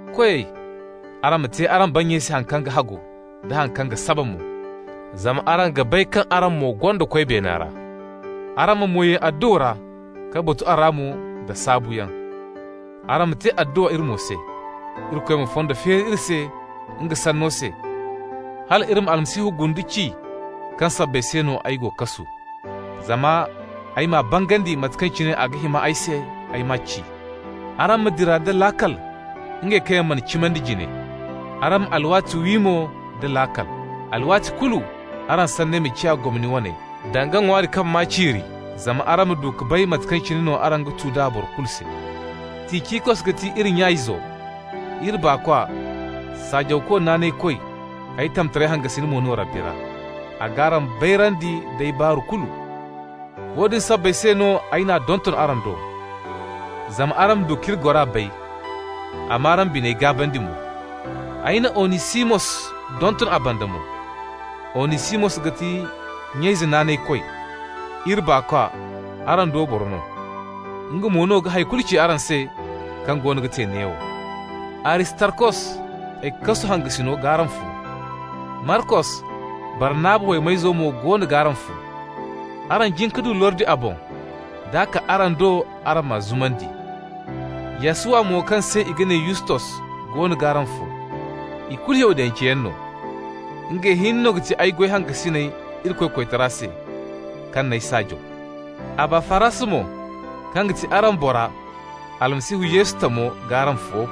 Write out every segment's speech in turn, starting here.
Koyey, araŋ ma te araŋ bannyey se haŋ kaŋ ga hagu, da haŋ kaŋ ga saba mo, zama araŋ ga bay kaŋ araŋ mo gonda Koy beena ra. Araŋ ma mo ye adduwa ra ka batu a ra mo nda saabuyaŋ. Araŋ ma te adduwa iri mo se, Irikoy ma fondo feeri iri se nga sanno se, hal iri ma Almasihu gundu ci kaŋ sabbay se no ay go kasu. Zama ay m'a bangandi mate kaŋ cine a ga hima ay se ay ma ci. Araŋ ma dira nda laakal ngey kaŋ yaŋ mana cimandi jine. Araŋ ma alwaati wi mo da laakal. Alwaati kulu araŋ sanney ma ciya gomni waney, danga ŋwaari kaŋ maa ciiri, zama araŋ ma du ka bay mate kaŋ cine no araŋ ga tu d'a boro kulu se. Ticikos ga ti iri nya-izo, iri baakwa, saajawko naanaykoy, ay tamtaray hangasin mo no Rabbi ra. A g'araŋ bayrandi d'ay baaru kulu. Woodin sabbay se no ay n'a donton araŋ do, zama araŋ ma du k'iri gora bay, a m'araŋ biney gaabandi mo. Ay na Onisimos donton a banda mo. Onisimos ga ti nya-ize naanaykoy, iri baakwa, araŋ do boro no. Nga mo no ga hay kulu ci araŋ se kaŋ goono ga te neewo. Aristarkos, ay kasu hangasino g'araŋ fo. Markos, Barnaba waymayzo mo goono g'araŋ fo. Araŋ jin ka du lordi a boŋ, d'a kaa araŋ do araŋ m'a zumandi. Yasuwa mo, kaŋ se i ga ne Yustos, goono g'araŋ fo. Ikulu Yahudance yaŋ no. Ngey hinne no ga ti ay goy hangasiney Irikoy koytara se kaŋ n'ay saajaw. Abafaras mo, kaŋ ga ti araŋ bora, Almasihu Yesu tamo, g'araŋ fo.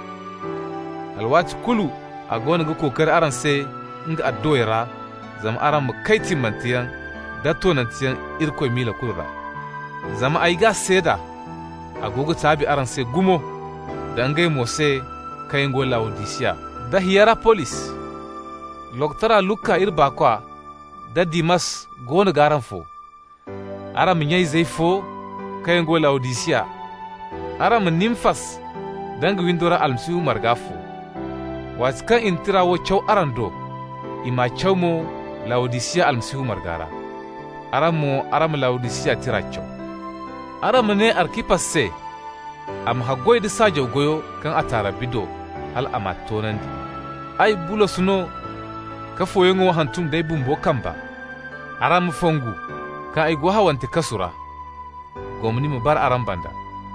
Alwaati kulu a goono ga kookari araŋ se nga adduwey ra zama araŋ ma kay timmanteyaŋ da toonanteyaŋ Irikoy miila kulu ra. Zama ay g'a seeda: a go ga taabi araŋ se gumo, da ngey mo se kaŋ yaŋ go Lawodisiya da Hiyarapolis. Lokotoro Luka, iri baakwa, da Dimas goono g'araŋ fo. Araŋ ma nya-izey fo kaŋ yaŋ go Lawodisiya. Araŋ ma Nimfas da nga windo ra Almasihu marga fo. Waati kaŋ i na tira wo caw araŋ do, i m'a caw mo Lawodisiya Almasihu marga ra. Araŋ mo, araŋ ma Lawodisiya tira caw. Araŋ ma ne Arkipas se a ma haggoy da saajaw goyo kaŋ a ta Rabbi do, hal a m'a toonandi. Ay, Bulos no ka fooyaŋ wo hantum d'ay bumbo kamba. Araŋ ma fongu kaŋ ay go hawante kasu ra. Gomni ma bara araŋ banda.